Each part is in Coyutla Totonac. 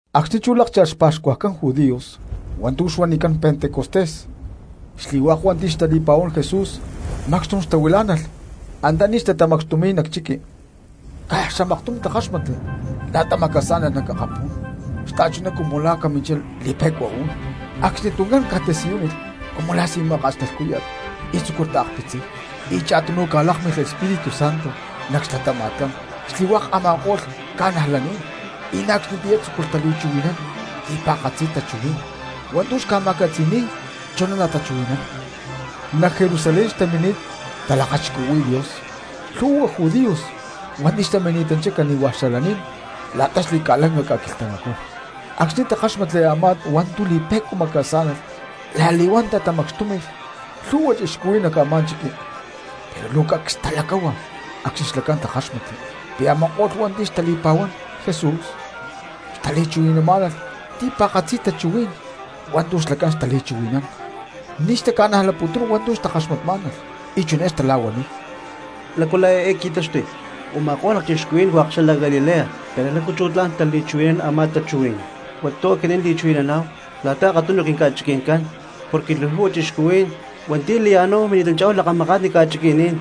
Acxni̠ chú lákcha̠lh xpa̠xcuajcán judíos hua̠ntu̠ xuanicán Pentecostés, xli̠hua̠k hua̠nti̠ xtali̠pa̠huán Jesús macxtum xtahuilá̠nalh antaní xtatamacxtumi̠y nac chiqui. Caj xamaktum takáxmatli la̠ta macasá̠nalh nac akapú̠n xta̠chuná cumu la̠ a̠ caminchá li̠pe̠cua uún. Acxni tuncán ca̠tasiyúnilh cumu la̠ si̠máka̠t xla lhcúya̠t y tzúculh taakpitziy. Y cha̠tunu ca̠lákmilh Espíritu Santo nac xlatama̠tcán xli̠hua̠k a̠ma̠ko̠lh cristianos, y na̠ acxnitiyá tzúculh tali̠chuhui̠nán ti̠pa̠katzi tachuhuí̠n hua̠ntu̠ xca̠ma̠catzi̠ni̠y chuná natachuhui̠nán. Nac Jerusalén xtamini̠t talakachixcuhui̠y Dios lhu̠hua judíos hua̠nti̠ xtamini̠tanchá cani̠hua̠ xalaní̠n la̠ta xli̠ca̠lanca ca̠quilhtamacú. Acxni̠ takáxmatli a̠má hua̠ntu̠ li̠pe̠cua macasá̠nalh la̠li̠huán tatamacxtúmi̠lh lhu̠hua cristianos nac a̠má chiqui, pero luu cacs talacáhua acxni̠ xlacán takáxmatli pi̠ a̠ma̠ko̠lh hua̠nti̠ xtali̠pa̠huán Jesús xtali̠chuhui̠namá̠nalh ti̠pa̠katzi tachuhuí̠n hua̠ntu̠ xlacán xtali̠chuhui̠nán. Ni̠ xtaca̠najlaputún hua̠ntu̠ xtakaxmatmá̠nalh y chiné xtala̠huaniy: —¿Lácu la̠ eé qui̠taxtuy? Uma̠kó̠lh lacchixcuhuí̠n hua̠k xalac Galilea, pero, ¿lácu chú tla̠n tali̠chuhui̠nán a̠má tachuhuí̠n hua̠ntu̠ aquinín li̠chuhui̠naná̠hu la̠ta akatunu quinca̠chiqui̠ncán? Porque luu lhu̠hua cristianos hua̠nti̠ laya̠náhu mini̠tanchá̠hu lakamakatni ca̠chiqui̠ní̠n;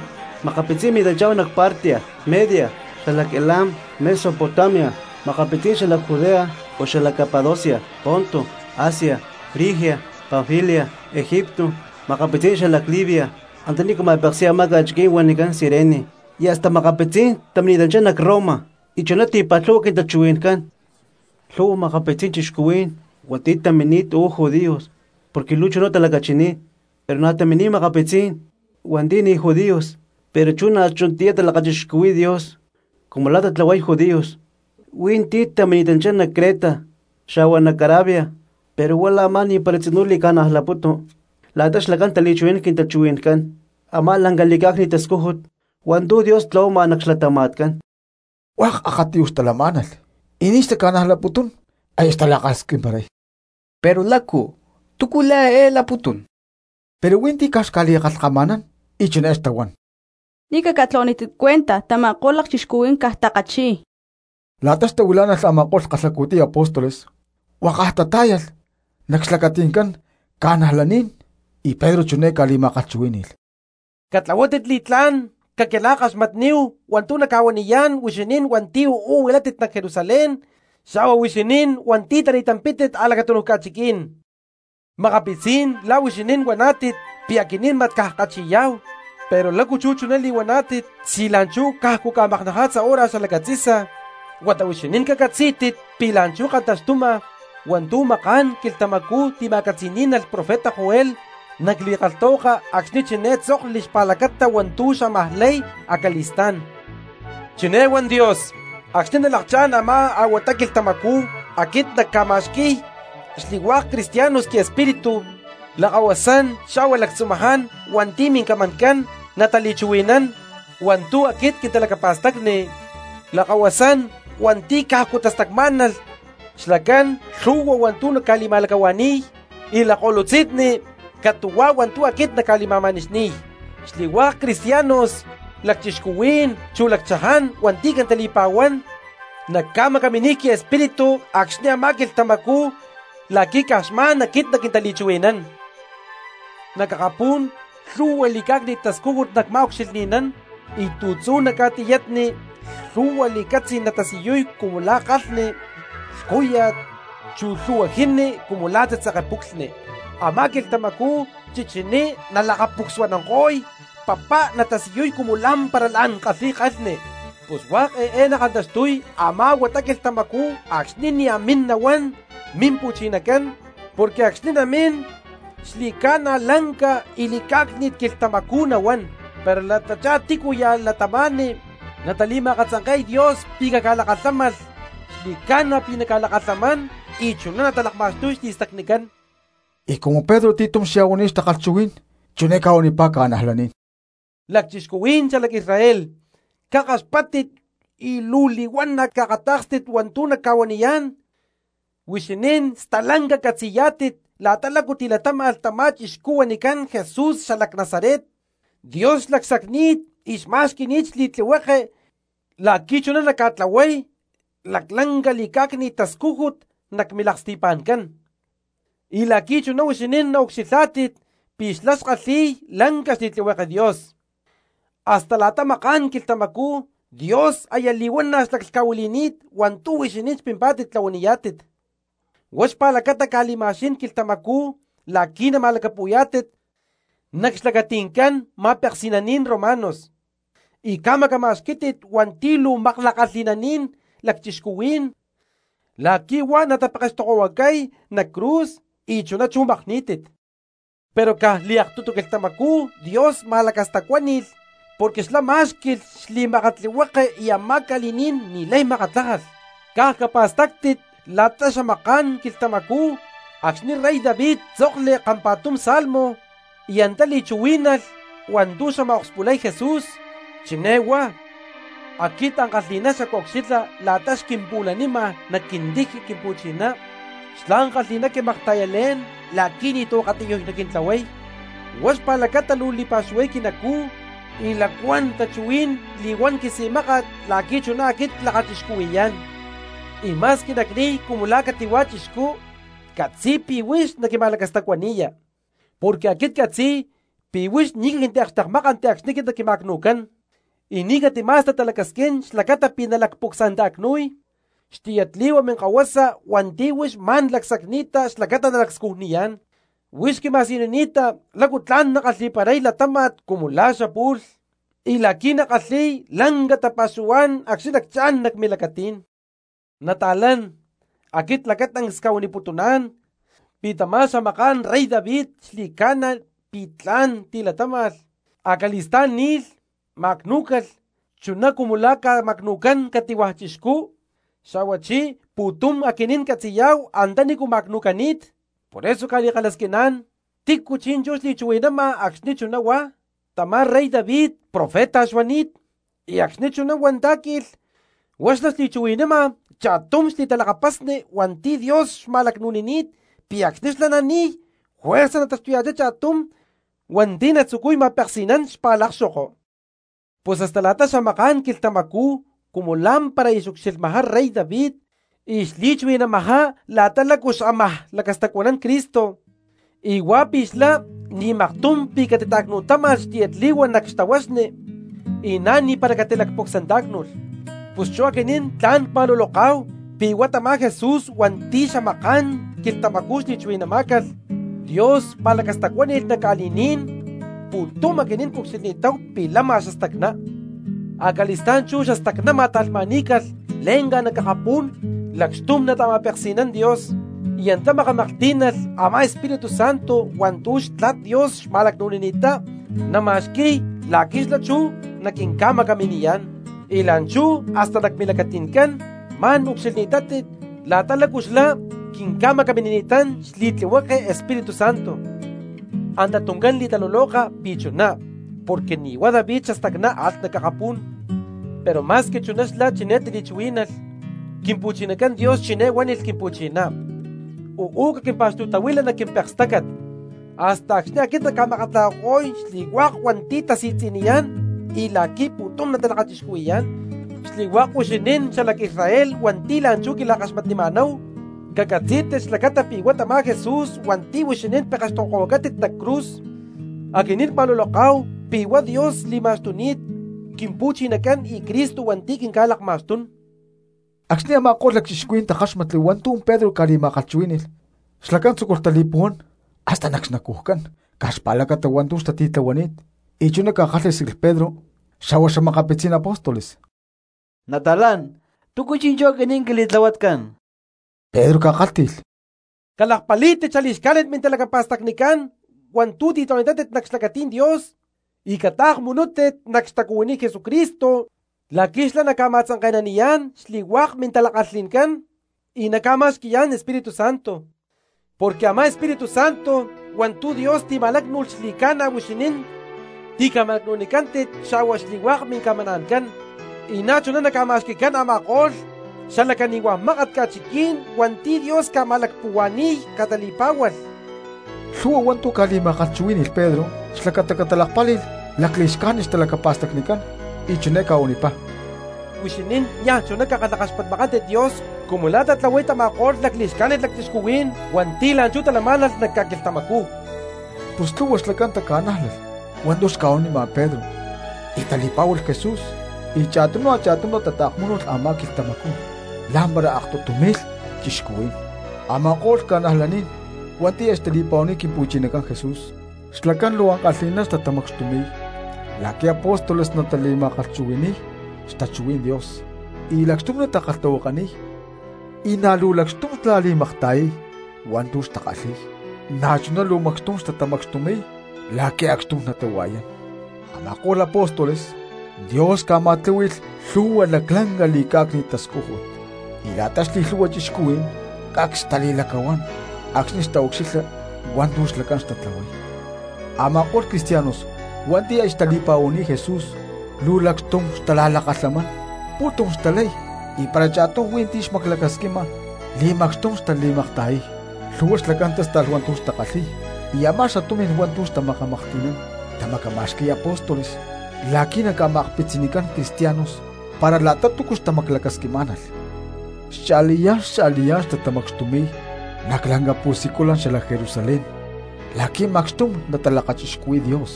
makapitzí̠n tamini̠tanchá nac Partia, Media, xalac Elam, Mesopotamia; makapitzí̠n xalac Judea o xalac Capadocia, Ponto, Asia, Frigia, Panfilia, Egipto; makapitzí̠n xalac Libia antanícu ma̠peksi̠y a̠má ca̠chiquí̠n huanicán Cirene, y hasta makapitzí̠n tamini̠tanchá nac Roma y chuná ti̠pa̠lhu̠hua quintachuhui̠ncán. Lhu̠hua makapitzí̠n cristianos hua̠nti̠ tamini̠t uú judíos porque luu chuná talacachini̠t, pero na̠ tamini̠t makapitzí̠n hua̠nti̠ ni̠ judíos pero chú na̠ chunatiyá talakachixcuhui̠y Dios cumu la̠ tatlahuay judíos, hui̠ntí tamini̠tanchá nac Creta xa̠hua nac Arabia. ¡Pero huá la̠ a̠má ni̠para tzinú li̠ca̠najlaputu la̠ta xlacán tali̠chuhui̠nán nac quintachuhui̠ncán a̠má lanca li̠cá̠cni̠t tascújut hua̠ntu̠ Dios tlahuama nac xlatama̠tcán! Hua̠k akatiyuj xtalamá̠nalh y ni̠ xtaca̠najlaputún, aya xtala̠kalhasquimparay: —Pero, ¿lácu? ¿Túcu la̠ eé laputún? Pero hui̠ntí caj xca̠li̠kalhkama̠nán y chiné xtahuán: —¡Ni̠ caca̠tlahuanítit cuenta, tama̠ko̠lh lacchixcuhuí̠n caj takachi̠y! La̠ta xtahuilá̠nalh a̠ma̠ko̠lh kalhacu̠tiy apóstoles huakaj tatá̠yalh nac xlacati̠ncán cristianos y Pedro chiné ca̠li̠ma̠kalhchuhuí̠ni̠lh: —¡Catlahuátit li̠tlá̠n caquila̠kaxmatníhu hua̠ntu̠ nacca̠huaniyá̠n huixinín hua̠nti̠ uú huilátit nac Jerusalén, xa̠hua huixinín hua̠nti̠ tani̠tampi̠tit a̠lacatunuj ca̠chiquí̠n! Makapitzí̠n la̠ huixinín huaná̠tit pi̠ aquinín mat caj ckachi̠yá̠hu; pero, ¿lácu chuná li̠huaná̠tit si la̠nchú cajcu ca̠maknaja̠tza hora xalacatzi̠sa? Huata huixinín cacatzí̠tit pi̠ la̠nchú kantaxtuma hua̠ntu̠ maká̠n quilhtamacú tima̠catzi̠ní̠nalh profeta Joel nac li̠kalhtahuaka acxni̠ chiné tzokli xpa̠lacata hua̠ntu̠ xamaj lay acali̠stá̠n: Chiné huán Dios: Acxni̠ nalakchá̠n a̠má a̠huata quilhtamacú aquit nacca̠ma̠xqui̠y xli̠hua̠k cristianos quiEspíritu. Lakahuasán xa̠hua lactzumaján hua̠nti̠ mincamancán natali̠chuhui̠nán hua̠ntu̠ aquit quintalacapa̠stacni. Lakahuasán hua̠nti̠ cajcu tastacmá̠nalh xlacán lhu̠hua hua̠ntu̠ nacca̠li̠ma̠lacahua̠ni̠y, y lakko̠lutzi̠nni catu̠huá hua̠ntu̠ aquit nacca̠li̠ma̠ma̠nixni̠y. Xli̠hua̠k cristianos lacchixcuhuí̠n chu lacchaján hua̠nti̠ quintali̠pa̠huán nacca̠macaminiy quiEspíritu acxni̠ a̠má quilhtamacú la̠qui̠ caj xma̠n aquit naquintali̠chuhui̠nán. Nac akapú̠n lhu̠hua li̠cá̠cni̠t tascújut nacma̠ucxilhni̠nán, y tu̠tzú nac ca̠tiyatni lhu̠hua li̠catzí̠n natasiyuy cumu la̠ kalhni lhcúya̠t, chu lhu̠hua jini cumu la̠ tzitzeke puclhni. Amá quilhtamacú chichiní nalakapucsuananko̠y, papá natasiyuy cumu lá̠mpara la̠n kalhi̠y kalhni. Pus hua̠k eé nakantaxtuy a̠má a̠huata quilhtamacú acxni̠ nia̠ min nahuán Mimpu̠chinacán, porque acxni̠ namín xli̠ca̠na lanca y li̠cá̠cni̠t quilhtamacú nahuán. Pero la̠tachá tícuya̠ cristianos natali̠ma̠katzanke̠y Dios pi̠ caca̠lakalhámalh, xli̠ca̠na pi̠ naca̠lakalhamán y chuná natalakma̠xtuy xli̠stacnicán. Y cumu Pedro ti̠tum xya̠huani̠t xtakalhchuhuí̠n chiné ca̠huanipá cristianos: —¡Lacchixcuhuí̠n xalac Israel, cakaxpáttit y luu li̠huana̠ caakatá̠kstit hua̠ntu̠ nacca̠huaniyá̠n! Huixinín stalanca catzi̠yá̠tit la̠ta lácu tilatáma̠lh tamá chixcú huanicán Jesús xalac Nazaret. Dios xlacsacni̠t y xma̠xqui̠ni̠t xli̠tlihueke la̠qui̠ chuná naca̠tlahuay laclanca li̠cá̠cni̠t tascújut nac milaksti̠pa̠ncán, y la̠qui̠ chuná huixinín naucxilhá̠tit pi̠ xlá xkalhi̠y lanca xli̠tlihueke Dios. Hasta la̠ta maká̠n quilhtamacú Dios aya li̠huana̠ xlaclhca̠huili̠ni̠t hua̠ntu̠ huixinín xpimpá̠tit tlahuaniyá̠tit, huá xpa̠lacata ca̠li̠ma̠xquí̠n quilhtamacú la̠qui̠ nama̠lacapu̠yá̠tit nac xlacati̠ncán ma̠peksi̠naní̠n romanos, y ca̠macama̠xquí̠tit hua̠nti̠ luu makla̠kalhi̠naní̠n lacchixcuhuí̠n la̠qui̠ huá natapekextokohuacay nac cruz, y chuná chú makní̠tit. Pero caj liaktutu quilhtamacú Dios ma̠lacastacuáni̠lh porque xlá má̠xqui̠lh xli̠makatlihueke y a̠má ca̠li̠ní̠n ni̠lay makatlájalh. Caj capa̠stáctit la̠ta xamaká̠n quilhtamacú acxni̠ rey David tzokli kampa̠tum Salmo y antá li̠chuhuí̠nalh hua̠ntu̠ xamaj akspulay Jesús, chiné huá: Aquit ankalhi̠ná xacucxilha la̠ta xquimpu̠lanima nac quintiji Quimpu̠chiná; xlá ankalhi̠ná quimakta̠yalé̠n la̠qui̠ ni̠tu̠ akatiyuj naquintlahuay. Huá xpa̠lacata luu li̠pa̠xuhuay quinacú, y lacuán tachuhuí̠n cli̠huán quisi̠máka̠t la̠qui̠ chuná aquit clakachixcuhui̠yá̠n. Y ma̠squi nacni̠y cumu la̠ cati̠hua̠ chixcú, ccatzi̠y pi̠ huix naquima̠lacastacuani̠ya. Porque aquit ccatzi̠y pi̠ huix ni̠ caquintiakxtekmákanti acxni̠ naquima̠cnu̠cán, y ni̠ catima̠sta talacasquín xlacata pi̠ nalacpucsanta̠cnu̠y xtiyatli̠hua minkahuasa hua̠nti̠ huix ma̠n lacsacni̠ta xlacata nalacscujniyá̠n. Huix quima̠siyunini̠ta lácu tla̠n nackalhi̠paray latáma̠t cumu la̠ xapu̠lh, y la̠qui̠ nackalhi̠y lanca tapa̠xuhuá̠n acxni̠ nacchá̠n nac milacatí̠n. ’Nata̠lán, aquit lacatancs cca̠huaniputuná̠n pi̠ tamá xamaká̠n rey David xli̠ca̠na pi̠ tla̠n tilatáma̠lh, acali̠stá̠n ni̠lh, ma̠cnú̠calh, chuná cumu la̠ ca̠ma̠cnu̠cán cati̠hua̠ cristiano; xa̠huachí pu̠tum aquinín catzi̠yá̠hu antanícu ma̠cnu̠cani̠t. Por eso cca̠li̠kalhasquiná̠n, ¿tícu chi̠nchú xli̠chuhui̠nama acxni̠ chuná huá? Tamá rey David profeta xuani̠t, y acxni̠ chuná huantá̠qui̠lh huá xlá xli̠chuhui̠nama cha̠tum xli̠talakapasni hua̠nti̠ Dios xma̠lacnu̠nini̠t pi̠ acxni̠ xlá nani̠y juerza nataxtuya̠chá cha̠tum hua̠nti̠ natzucuy ma̠peksi̠nán xpa̠lakxoko. Pus hasta la̠ta xamaká̠n quilhtamacú cumu la̠mpara aya xucxilhma rey David y xli̠chuhui̠namajá la̠ta lácu xamaj lacastacuanán Cristo y huá pi̠ xlá ni̠ maktum pi̠ catita̠cnu̠táma̠lh xtiyatli̠hua nac xtahuaxni y na̠ ni̠para catilacpucsantá̠cnu̠lh. Pus chú aquinín tla̠n cma̠luloká̠hu pi̠ huá tamá Jesús hua̠nti̠ xamaká̠n quilhtamacú xli̠chuhui̠namá̠calh, Dios ma̠lacastacuani̠ni̠t nac ca̠li̠ní̠n, pu̠tum aquinín cucxilhni̠táhu pi̠ lama xastacná. Acali̠stá̠n chú xastacná ma̠ta̠lhma̠ní̠calh le̠nca nac akapú̠n lacxtum nata̠ma̠peksi̠nán Dios, y antá makamaklhtí̠nalh a̠má Espíritu Santo hua̠ntu̠ Xtla̠t Dios xma̠lacnu̠nini̠ttá nama̠xqui̠y la̠qui̠ xlá chú naquinca̠macaminiyá̠n. Y la̠nchú hasta nac milacati̠ncán ma̠n ucxilhni̠tátit la̠ta lácu xlá quinca̠macaminini̠tán xli̠tlihueke Espíritu Santo. Anta tuncán li̠taluloka pi̠ chuná porque ni̠huá David xastacná alh nac akapú̠n, pero ma̠squi chuná xlá chiné tili̠chuhuí̠nalh: Quimpu̠chinacán Dios chiné huánilh Quimpu̠chiná: “Uú caquimpa̠xtu̠tahuila nac quimpekstácat hasta acxni̠ aquit nacca̠makatlajako̠y xli̠hua̠k hua̠nti̠ tasi̠tzi̠niyá̠n, y la̠qui̠ pu̠tum natalakachixcuhui̠yá̠n.” ’Xli̠hua̠k huixinín cristianos xalac Israel hua̠nti̠ la̠nchú quila̠kaxmatnima̠náhu, cacatzí̠tit xlacata pi̠ huá tamá Jesús hua̠nti̠ huixinín pekextokohuacátit nac cruz, aquinín cma̠luloká̠hu pi̠ huá Dios li̠ma̠xtuni̠t Quimpu̠chinacán y Cristo hua̠nti̠ quinca̠lakma̠xtún. Acxni̠ a̠ma̠ko̠lh cristianos takáxmatli hua̠ntu̠ Pedro ca̠li̠ma̠kalhchuhuí̠ni̠lh xlacán tzúculh tali̠puhuán hasta nac xnacujcán caj xpa̠lacata hua̠ntu̠ xtati̠tlahuani̠t, y chiná takalhásquilh Pedro xa̠hua xa̠makapitzí̠n apóstoles: —Nata̠lán, ¿túcu chi̠nchú aquinín quili̠tlahuatcán? Pedro ca̠kálhti̠lh: —Calakpalí̠tit xali̠xcajnit mintalacapa̠stacnicán hua̠ntu̠ ti̠tlahuani̠tátit nac xlacatí̠n Dios, y cataakmunútit nac xtacuhuiní Jesucristo la̠qui̠ xlá naca̠ma̠tzanke̠naniyá̠n xli̠hua̠k mintala̠kalhi̠ncán y na̠ naca̠ma̠xqui̠yá̠n Espíritu Santo. Porque a̠má Espíritu Santo hua̠ntu̠ Dios tima̠lácnu̠lh xli̠ca̠na huixinín tica̠ma̠lacnu̠nicántit xa̠hua xli̠hua̠k mincamana̠ncán, y na̠chuná naca̠ma̠xqui̠cán a̠ma̠ko̠lh cristianos xala cani̠huá mákat ca̠chiquí̠n hua̠nti̠ Dios ca̠ma̠lacpuhua̠ni̠y catali̠pá̠hualh. Lhu̠hua hua̠ntu̠ ca̠li̠ma̠kalhchuhuí̠ni̠lh Pedro xlacata catalakpáli̠lh lacli̠xcájnit xtalacapa̠stacnicán, y chiné ca̠huanipá: —Huixinín niaj chuná cakalhakaxpatmakántit Dios cumu la̠ tatlahuay tama̠ko̠lh lacli̠xcájnit cristianos hua̠nti̠ la̠nchú talamá̠nalh nac ca̠quilhtamacú. Pus lhu̠hua xlacán taca̠nájlalh hua̠ntu̠ xca̠huanima Pedro y tali̠pá̠hualh Jesús, y cha̠tunu cha̠tunu tataakmúnulh a̠má quilhtamacú, la̠mpara aktutu mi̠lh cristianos. Ama̠ko̠lh cristianos hua̠nti̠ aya xtali̠pa̠huani̠t Quimpu̠chinacán Jesús xlacán luu ankalhi̠ná xtatamacxtumi̠y la̠qui̠ apóstoles natali̠ma̠kalhchuhui̠ni̠y xtachuhuí̠n Dios y lacxtum natakalhtahuakaniy, y na̠ luu lacxtum xla̠li̠makta̠yay hua̠ntu̠ xtakalhi̠y, na̠chuná luu macxtum xtatamacxtumi̠y la̠qui̠ acxtum natahua̠yán. Ama̠ko̠lh apóstoles, Dios ca̠ma̠tláhui̠lh lhu̠hua laclanca li̠cá̠cni̠t tascújut, y la̠ta xli̠lhu̠hua cristianos cacs xtali̠lacahuán acxni̠ xtaucxilha hua̠ntu̠ xlacán xtatlahuay. Ama̠ko̠lh cristianos hua̠nti̠ aya xtali̠pa̠huani̠t Jesús luu lacxtum xtala̠lakalhamán, pu̠tum xtalay y para cha̠tum hui̠ntú xmaclacasquima li̠macxtum xtali̠makta̠yay. Lhu̠hua xlacán tásta̠lh hua̠ntu̠ xtakalhi̠y y a̠má xatumi̠n hua̠ntu̠ tamaklhtí̠nalh tamacamá̠xqui̠lh apóstoles la̠qui̠ naca̠ma̠akpitzinicán cristianos para la̠ta túcu xtamaclacasquimá̠nalh. Xcha̠liyá̠n xcha̠liyá̠n xtatamacxtumi̠y nac lanca pu̠siculan xalac Jerusalén la̠qui̠ macxtum natalakachixcuhui̠y Dios,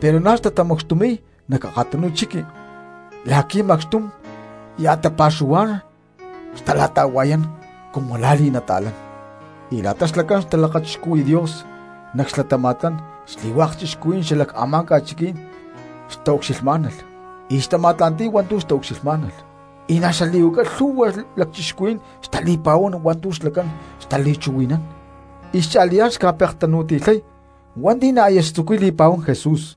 pero na̠ xtatamacxtumi̠y nac akatunu chiqui la̠qui̠ macxtum ya̠ tapa̠xuhuá̠n natala̠ta̠hua̠yán cumu la̠ li̠nata̠lán. Y la̠ta xlacán xtalakachixcuhui̠y Dios nac xlatama̠tcán xli̠hua̠k cristianos xalac a̠má ca̠chiquí̠n xtaucxilhmá̠nalh y xtama̠tla̠nti̠y hua̠ntu̠ xtaucxilhmá̠nalh. Y na̠ xali̠huaca lhu̠hua cristianos xtali̠pa̠huán hua̠ntu̠ xlacán xtali̠chuhui̠nán y cha̠liyá̠n xca̠pektanu̠ti̠lhay hua̠nti̠ na̠ aya xtzucuy li̠pa̠huán Jesús.